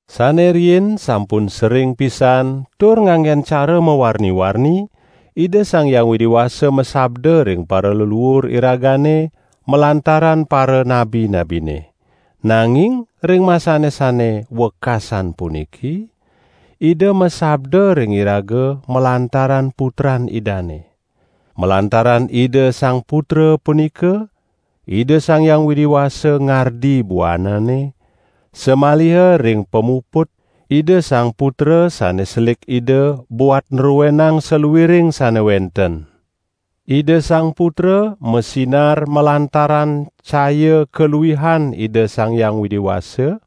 Sane riin sampun sering pisan tur nganggen cara mawarni-warni Ida Sang Hyang Widi Wasa masabda ring paraleluur iragane malantaran paranabi-nabine, nanging ring masane sane wekasan puniki Ida masabda ring iraga malantaran Putran Idane. Malantaran Ida Sang Putra punika, Ida Sang Hyang Widi Wasa ngardi buanane, samaliha ring pamuput, Ida Sang Putra sane selik Ida buat nruenang saluiring sane wenten. Ida Sang Putra masinar malantaran caya kaluihan Ida Sang Hyang Widi Wasa;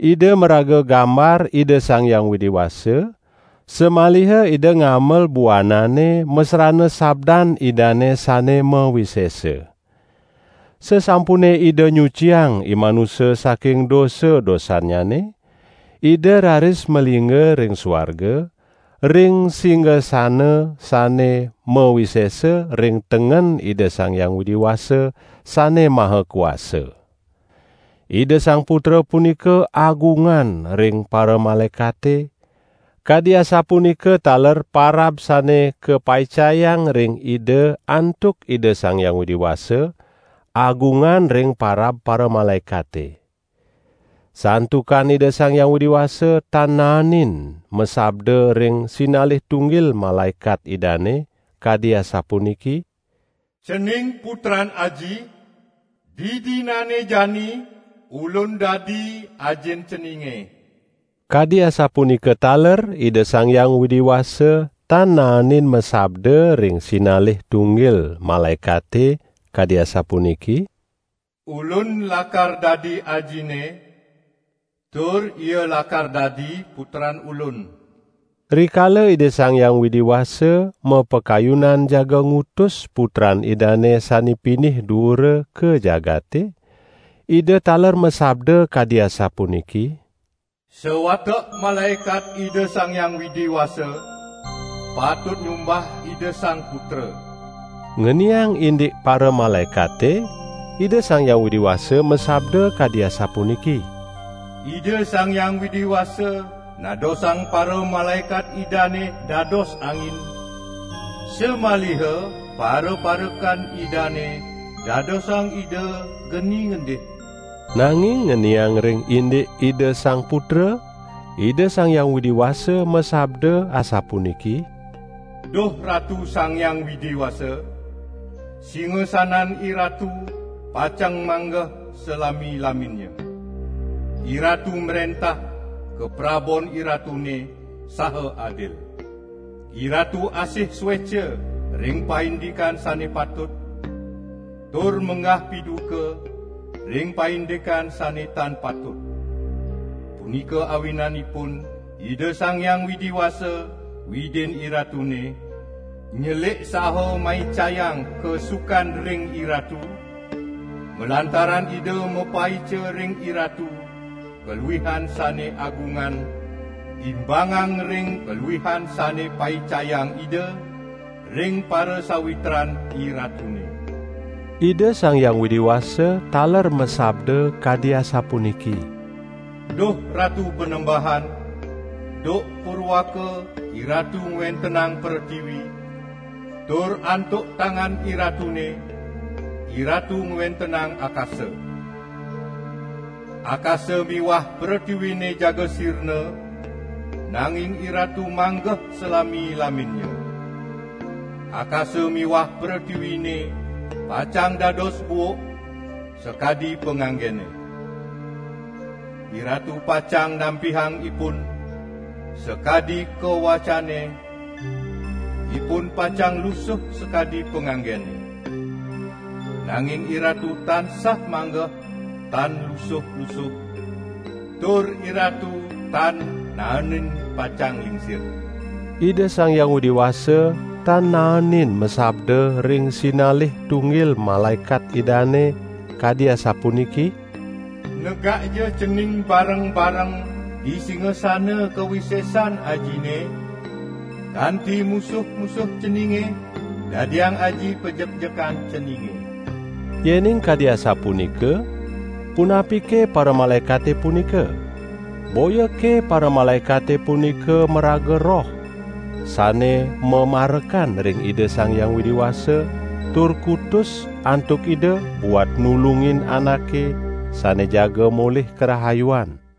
Ida maraga gambar Ida Sang Hyang Widi Wasa, samaliha Ida ngamel buanane masrana sabdan Idane sane mawisesa. Sasampune Ida nyuciang imanusa saking dosa-dosannyane, Ida raris malingga ring suarga, ring singasana sane mawisesa ring tengen Ida Sang Hyang Widi Wasa Sane Maha Kuasa. Ida Sang Putra punika agungan ring paramalaekate, kadi asapunika taler parab sane kapaicayang ring Ida antuk Ida Sang Hyang Widi Wasa, agungan ring parab paramalaekate. Santukan Ida Sang Hyang Widi Wasa, tan naenin masabda ring sinalih tunggil malaekat Idane, kadi asapuniki: "Cening, Putran Aji; didinane jani Ulun dadi Ajin ceninge." Kadi asapunika taler Ida Sang Hyang Widi Wasa tan naenin masabda ring sinalih tunggil malaekate, kadi asapuniki: "Ulun lakar dadi Ajinne, tur ia lakar dadi Putran Ulun." Rikala Ida Sang Hyang Widi Wasa mapakayunan jaga ngutus Putran Idane sane pinih duura ka jagate, Ida taler masabda kadi asapuniki: "Sawatek malaekat Ida Sang Hyang Widi Wasa patut nyumbah Ida Sang Putra." Ngeniang indik paramalaekate, Ida Sang Hyang Widi Wasa masabda kadi asapuniki: "Ida Sang Hyang Widi Wasa nadosang paramalaekat Idane dados angin, samaliha paraparekan Idane dadosang Ida geni ngendih." Nanging ngeniang ring indik Ida Sang Putra, Ida Sang Hyang Widi Wasa masabda asapuniki: "Duh Ratu Sang Hyang Widi Wasa, singasanan IRatu pacang manggeh salami-laminnya. IRatu mrentah kaprabon IRatune saha adil. IRatu asih sueca ring paindikan sane patut, tur menggah piduka ring paindikan sane tan patut; punika awinanipun Ida Sang Hyang Widi Wasa, Widin IRatune, nyelik saha maicayang kasukan ring IRatu, malantaran Ida mapaica ring IRatu kaluihan sane agungan imbangang ring kaluihan sane paicayang Ida ring parasawitran IRatune." Ida Sang Hyang Widi Wasa taler masabda kadi asapuniki: "Duh Ratu Panembahan, duk purwaka IRatu ngwentenang pretiwi, tur antuk tangan IRatune, IRatu ngwentenang akasa. Akasa miwah pretiwine jaga sirna, nanging IRatu manggeh salami-laminnya; akasa miwah pretiwine pacang dados buuk sakadi panganggene. IRatu pacang nampihang ipun sakadi kawacane, ipun pacang lusuh sakadi panganggene. Nanging IRatu tansah manggeh tan lusuh-lusuh, tur IRatu tan naenin pacang lingsir." Ida Sang Hyang Widi Wasa tan naenin masabda ring sinalih tunggil malaekat Idane, kadi asapuniki: "Negakja Cening bareng-bareng di singasana kawisesan Ajine, kanti musuh-musuh Ceninge dadiang Aji pajekjekan Ceninge." Yening kadi asapunika, punapike paramalaekate punika? Boyake paramalaekate punika maraga roh, sane mamarekan ring Ida Sang Hyang Widi Wasa tur kutus antuk Ida buat nulungin anake sane jaga molih karahayuan.